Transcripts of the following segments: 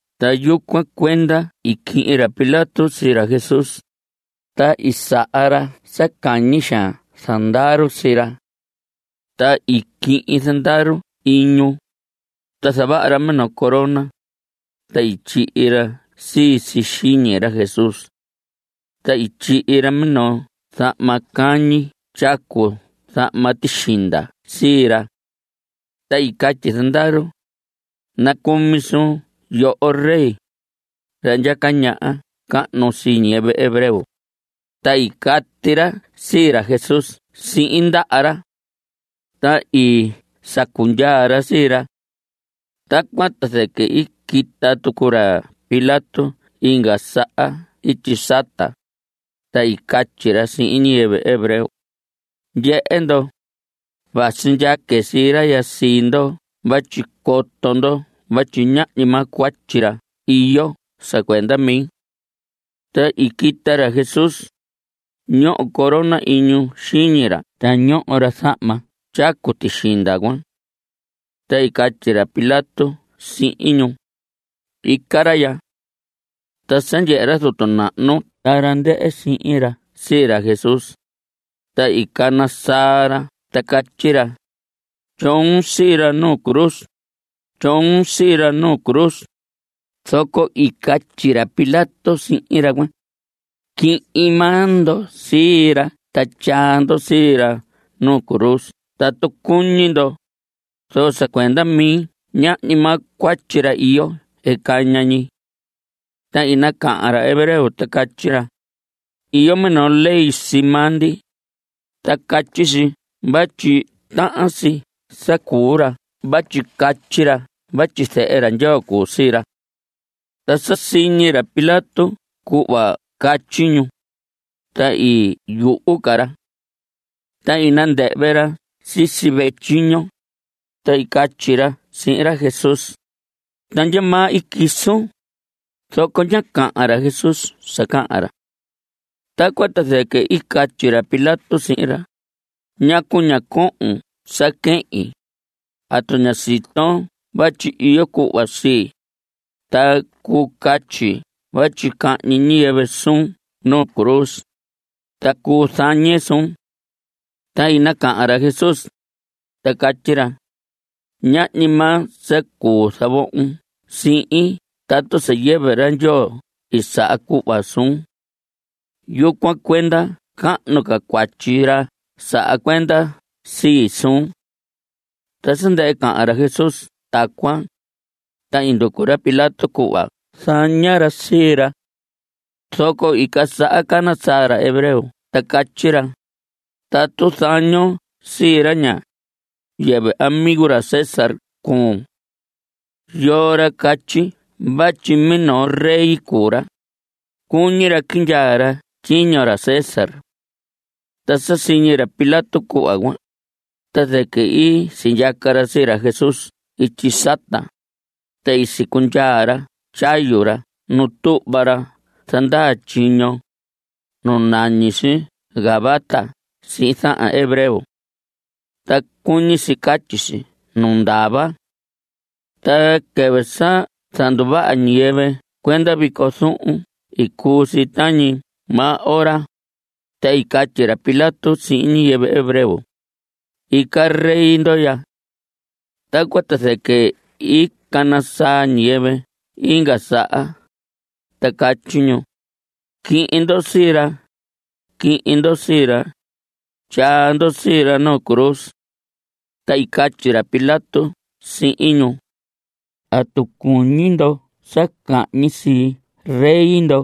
Ta yucuan cuenda i quihin ra Pilato sii ra Jesús, ta i saha ra sa cañi xaan zandaru sii ra. Ta i quihin zandaru iñu, ta zavaha ra minoo corona, ta i tyihi ra sii si xiñi ra Jesús. Ta i tyihi ra minoo zahma cañi tyacu zahma tixinda sii ra. Ta i catyi zandaru: ¡Nacumi suun yoho rey, ra ndyaca ñaha cahnu sii ñiyɨvɨ hebreo! Ta i cati ra sii ra Jesús sihin ndaha ra. Ta i sacu ndyaa ra sii ra. Tacuan ta zɨquɨ i quita tucu ra Pilato inga saha ityi sata, ta i catyi ra sihin ñiyɨvɨ hebreo: Ndyehe ndo, vasi ndyaque sii ra sii ndo vatyi coto ndo vatyi ñahñi maa cuatyi ra iyo sa cuenda mi. Ta i quita ra Jesús. Ñoho corona iñu xiñi ra ta ñoho ra zahma tyacu tixinda cuan. Ta i catyi ra Pilato sihin ñu: Ica ra ya. Ta sa ndyehe ra zutu nahnu ta ra ndɨhɨ sihin ra sii ra Jesús, ta i cana saa ra ta catyi ra: Tyoon sii ra nu cruz. Tyoon sii ra nu cruz. Zoco i catyi ra Pilato sihin ra cuan: Quihin maa ndo sii ra ta tyaa ndo sii ra nu cruz tatu cuñi ndo, zoco sa cuenda mi ñahñi maa cuatyi ra iyo caña ñi. Ta i nacahan ra hebreo ta catyi ra: Iyo minoo ley sii maa ndi, ta catyi si vatyi tahan si sa cuu ra vatyi catyi ra vatyi Zehe ra Ndyoo cuu sii ra. Ta sa siñi ra Pilato cuhva catyi ñu, ta i yuhu ca ra. Ta i nandɨhvɨ ra sisi vehe tyiño, ta i catyi ra sihin ra Jesús: ¿Ta ndyamaa i quisun? Zoco ñá cahan ra Jesús sa cahan ra. Tacuan ta zɨquɨ i catyi ra Pilato sihin ra: ¿Ñacu ña cohon sa quehin? ¿Atu ña siton vatyi iyo cuhva sii, ta cuu catyi vatyi cahñi ñiyɨvɨ suun nu cruz, ta cuu zañe suun? Ta i nacahan ra Jesús, ta catyi ra: Ñahñi maa sa cuu zavohon sihin tatu sa yɨvɨ ra Ndyoo i saha cuhva suun. Yucuan cuenda cahnu ca cuatyi ra saha cuenda sii suun. Ta sa ndɨhɨ cahan ra Jesús tacuan, ta i nducu ra Pilato cuhva zaña ra sii ra. Zoco i quisaha cana saa ra hebreo ta catyi ra: Tatu zañon sii ra ña, yɨvɨ amigo ra César cuun. Yoo ra catyi vatyi minoo rey cuu ra, cuñi ra quindyaa ra tyiño ra César. Ta sa siñi ra Pilato cuhva cuan, ta zɨquɨ i sindyaca ra sii ra Jesús ityi sata, ta i sicundyaa ra tyayu ra nu tuhva ra zandaa tyiño, nu nañi si Gabata sihin zahan hebreo. Ta cuñi si catyi si Nu Ndava. Ta quɨvɨ sa zanduvaha ñiyɨvɨ cuenda vico zuhun i cuu si tañi maa ora, ta i catyi ra Pilato sihin ñiyɨvɨ hebreo: Ica rey ndo ya. Tacuan ta zɨquɨ i cana saa ñiyɨvɨ inga saha, ta catyi ñu: ¡Quihin ndo sii ra! ¡Quihin ndo sii ra! Tyaa ndo sii ra nu cruz. Ta i catyi ra Pilato sihin ñu: ¿Atu cuñi ndo sa cahñi sii rey ndo?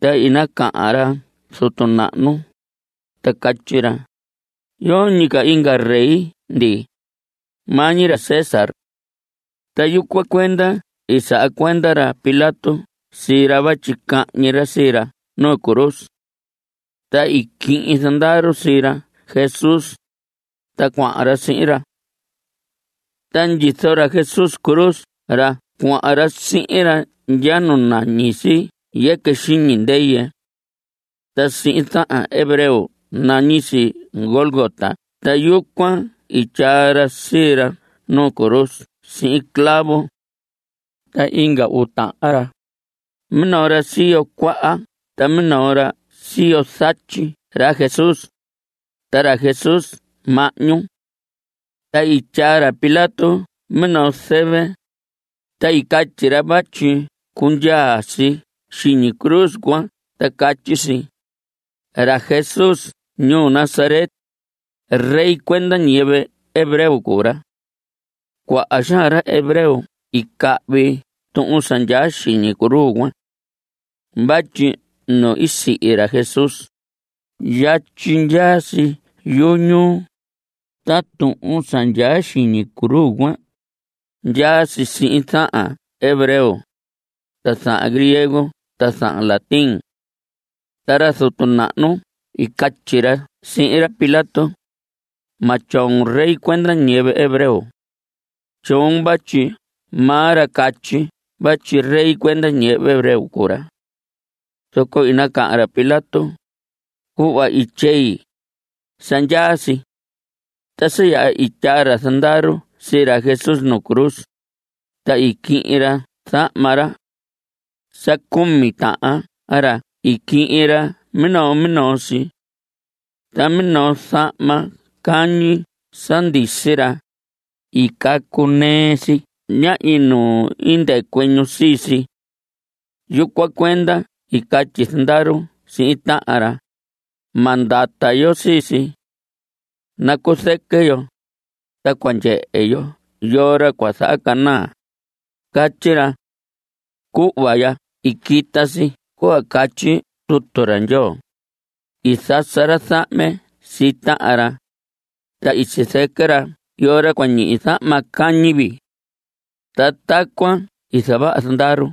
Ta i nacahan ra zutu nahnu, ta catyi ra: Yoñi ca inga rey ndi. Maa ñi ra César. Ta yucuan cuenda i saha cuenda ra Pilato sii ra vatyi cahñi ra sii ra nu cruz. Ta i quihin zandaru sii ra Jesús, ta cuahan ra sihin ra. Ta ndyizo ra Jesús cruz ra cuahan ra sihin ra ndya nu nañi si Yɨquɨ Xiñi Ndɨyɨ. Ta sihin zahan hebreo nañi si Gólgota. Ta yucuan i tyaa ra sii ra nuu cruz sihin clavo. Ta inga uu tahan ra, minoo ra siyo cuaha ta minoo ra siyo zatyi ra Jesús, ta ra Jesús mahñu. Ta i tyaa ra Pilato minoo zɨvɨ, ta i catyi ra vatyi cundyaa si xiñi cruz cuan ta catyi si: “Ra Jesús ñuu Nazaret, rey cuenda ñiyɨvɨ hebreo cuu ra.” Cuaha xaan ra hebreo i cahvi tuhun sa ndyaa xiñi cruz cuan. Vatyi nu sihi ra Jesús, yatyi ndyaa si yuhu ñuu. Ta tuhun sa ndyaa xiñi cruz cuan, ndyaa si sihin zahan hebreo, zahan griego ta zahan latín. Ta ra zutu nahnu i catyi ra sihin ra Pilato: Ma tyoon: “Rey cuenda ñiyɨvɨ hebreo.” Tyoon vatyi maa ra catyi vatyi rey cuenda ñiyɨvɨ hebreo cuu ra. Zoco i nacahan ra Pilato: Cuhva i tyei, sa ndyaa si. Ta sa yaha i tyaa zandaru sii ra Jesús nu cruz, ta i quihin ra zahma ra. Sa cumi tahan ra i quihin ra minoo minoo si. Ta minoo zahma cañi sa ndisi ra, i cacu si ɨɨn ñi; ñahñi nu i ndɨcuɨ ñu sii si. Yucuan cuenda i catyi zandaru sihin tahan ra: Ma ndata yo sii si. Nacuzɨquɨ yo, ta cua ndyehe yo yoo ra cua zahacanaa. Catyi ra. Ta cuhva ya i quita si cuhva catyi Tutu ra Ndyoo: I zasa ra zahme sii tahan ra, Ta i sizɨquɨ ra yoo ra cua ñihi zahma cañi vii. Ta tacuan i zavaha zandaru.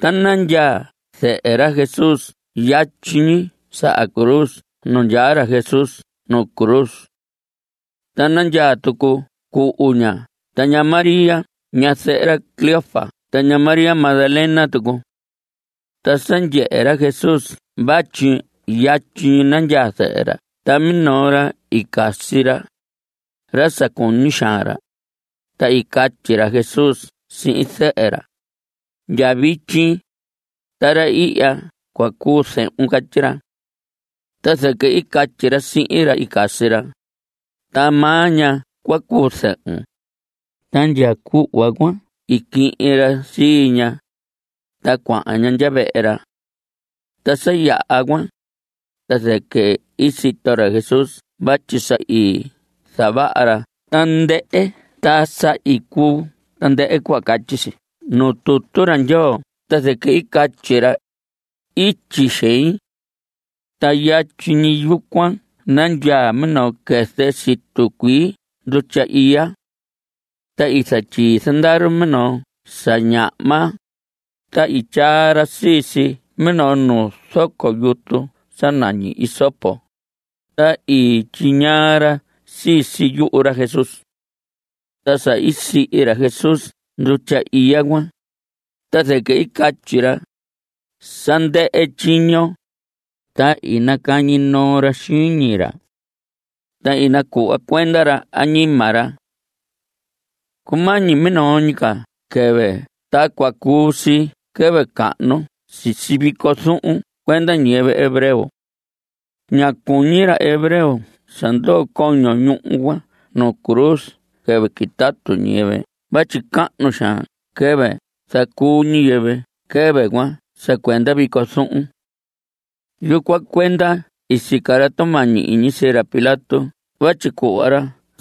Ta nandyaa zɨhɨ ra Jesús yatyi ñi saha cruz nu ndyaa ra Jesús nu cruz. Ta nandyaa tucu cuhu ña ta ña María ñazɨhɨ ra Cleofas ta ña María Magdalena tucu. Ta sa ndyehe ra Jesús vatyi yatyi nandyaa zɨhɨ ra ta minoo ra i casi ra, ra sa cuñi xaan ra, ta i catyi ra Jesús sihin zɨhɨ ra: Ndya vityi, ra ihya cua cuu zehun. Catyi ra. Ta zɨquɨ i catyi ra sihin ra i casi ra: Ta maa ña cua cuu zɨhun. Ta ndya cuhva cuan i quihin ra sii ña, ta cuahan ña vehe ra. Ta sa yaha cuan, ta zɨquɨ i sito ra Jesús vatyi sa i zavaha ra tandɨhɨ ta sa i cuu tandɨhɨ cuhva catyi si nuu Tutu ra Ndyoo. Ta zɨquɨ i catyi ra: Ityi xein. Ta yatyi ñi yucuan nandyaa minoo quɨzɨ situ cuii ndutya iya. Ta i zatyii zandaru minoo sa ñahma, ta i tyaa ra sii si minoo nuu zoco yutu sa nañi hisopo, ta i tyiñaa ra sii si yuhu ra Jesús. Ta sa i sihi ra Jesús ndutya iya cuan, ta zɨquɨ i catyi ra: Sa ndɨhɨ tyiño. Ta i nacañi noo ra xiñi ra, ta i nacuhva cuenda ra añima ra. Cumañi minoo ñi ca quɨvɨ ta cua cuu si quɨvɨ cahnu sisi vico zuhun cuenda ñiyɨvɨ hebreo. Ñá cuñi ra hebreo sa ndoo coño ñuhu cuan nu cruz quɨvɨ quitatu ñiyɨvɨ vatyi cahnu xaan quɨvɨ zacuu ñiyɨvɨ quɨvɨ cuan sa cuenda vico zuhun. Yucuan cuenda i sica ra tumañi iñi sii ra Pilato vatyi cuhva ra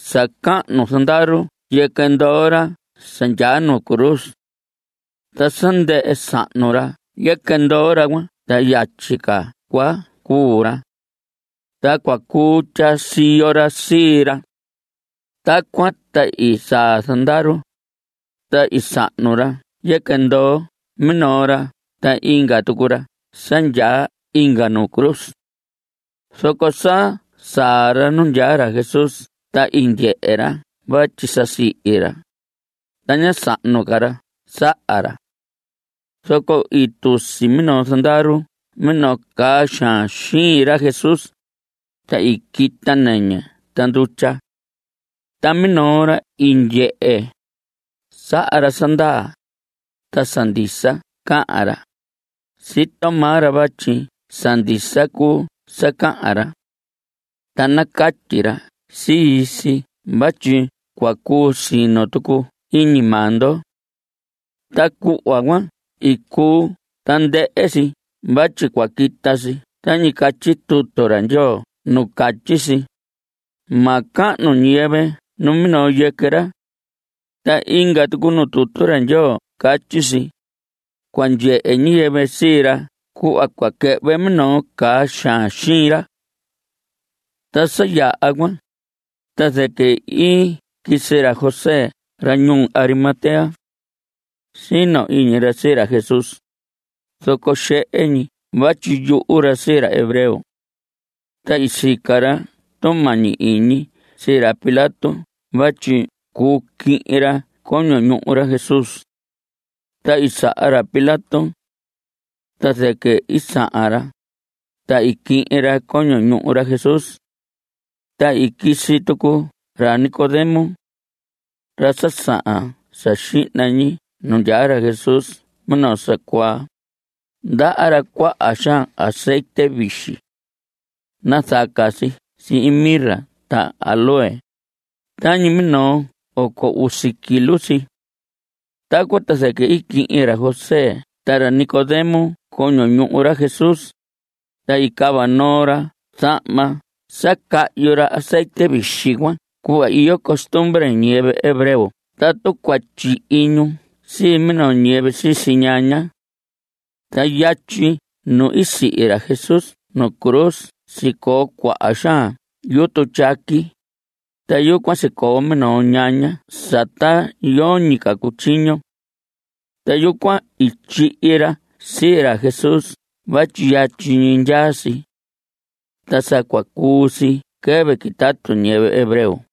sa cahnu zandaru yɨquɨ ndoo ra sa ndyaa nu cruz. (Ta sa ndɨhɨ sahnu ra yɨquɨ ndoo ra cuan ta yatyi ca cua cuu ra.) Ta cua cuu tyaa siyo ra sii ra. Tacuan ta i saa zandaru, ta i sahnu ra yɨquɨ ndoo minoo ra ta inga tucu ra sa ndyaa inga nu cruz. Zoco sa saa ra nu ndyaa ra Jesús ta i ndyehe ra vatyi sa sihi ra, ta ñá sahnu ca ra saha ra. Zoco i tusi minoo zandaru minoo caa xaan xiin ra Jesús, ta i quita nɨñɨ ta ndutya. Ta minoo ra i ndyehe, saha ra sa ndaa, ta sa ndisa cahan ra. Sito maa ra vatyi sa ndisa cuu sa cahan ra. Ta nacatyi ra sii si vatyi cua cuu sino tucu iñi maa ndo. Ta cuhva cuan i cuu tandɨhɨ si vatyi cua quita si tañi catyi Tutu ra Ndyoo nu catyi si: “Ma cahnu ñiyɨvɨ numinoo yɨquɨ ra.” Ta inga tucu nu tutu ra Ndyoo catyi si: “Cua ndyehe ñiyɨvɨ sii ra cuhva cua quɨhvɨ minoo caa xaan xiin ra.” Ta sa yaha cuan, ta zɨquɨ i quisi ra José ra ñuu Arimatea. Sino iñi ra sii ra Jesús, zoco xehe ñi vatyi yuhu ra sii ra hebreo. Ta i sica ra tumañi iñi sii ra Pilato vatyi cuu quihin ra coño ñuhu ra Jesús. Ta i saha ra Pilato. Ta zɨquɨ i sahan ra, ta i quihin ra coño ñuhu ra Jesús. Ta i quisi tucu ra Nicodemo, ra sa sahan sa xihna ñi nu ndyaa ra Jesús minoo sa cuaa. Ndaha ra cuaha xaan azetye vixi. Nazaca si sihin mirra ta áloe. Tañi minoo oco usi kilo si. Tacuan ta zɨquɨ i quihin ra José ta ra Nicodemo coño ñuhu ra Jesús, ta i cava noo ra zahma sa cahyu ra azetye vixi cuan cuhva iyo costumbre ñiyɨvɨ hebreo tatu cua tyihi ñu sii minoo ñiyɨvɨ sisi ñaña. Ta yatyi nu i sihi ra Jesús nu cruz sicoo cuaha xaan yutu tyaqui, ta yucuan sicoo minoo ñaña sa ta yoñi ca cutyiño. Ta yucuan i tyihi ra sii ra Jesús vatyi yatyi ñi ndyaa si. Ta sa cua cuu si quɨvɨ quitatu ñiyɨvɨ hebreo.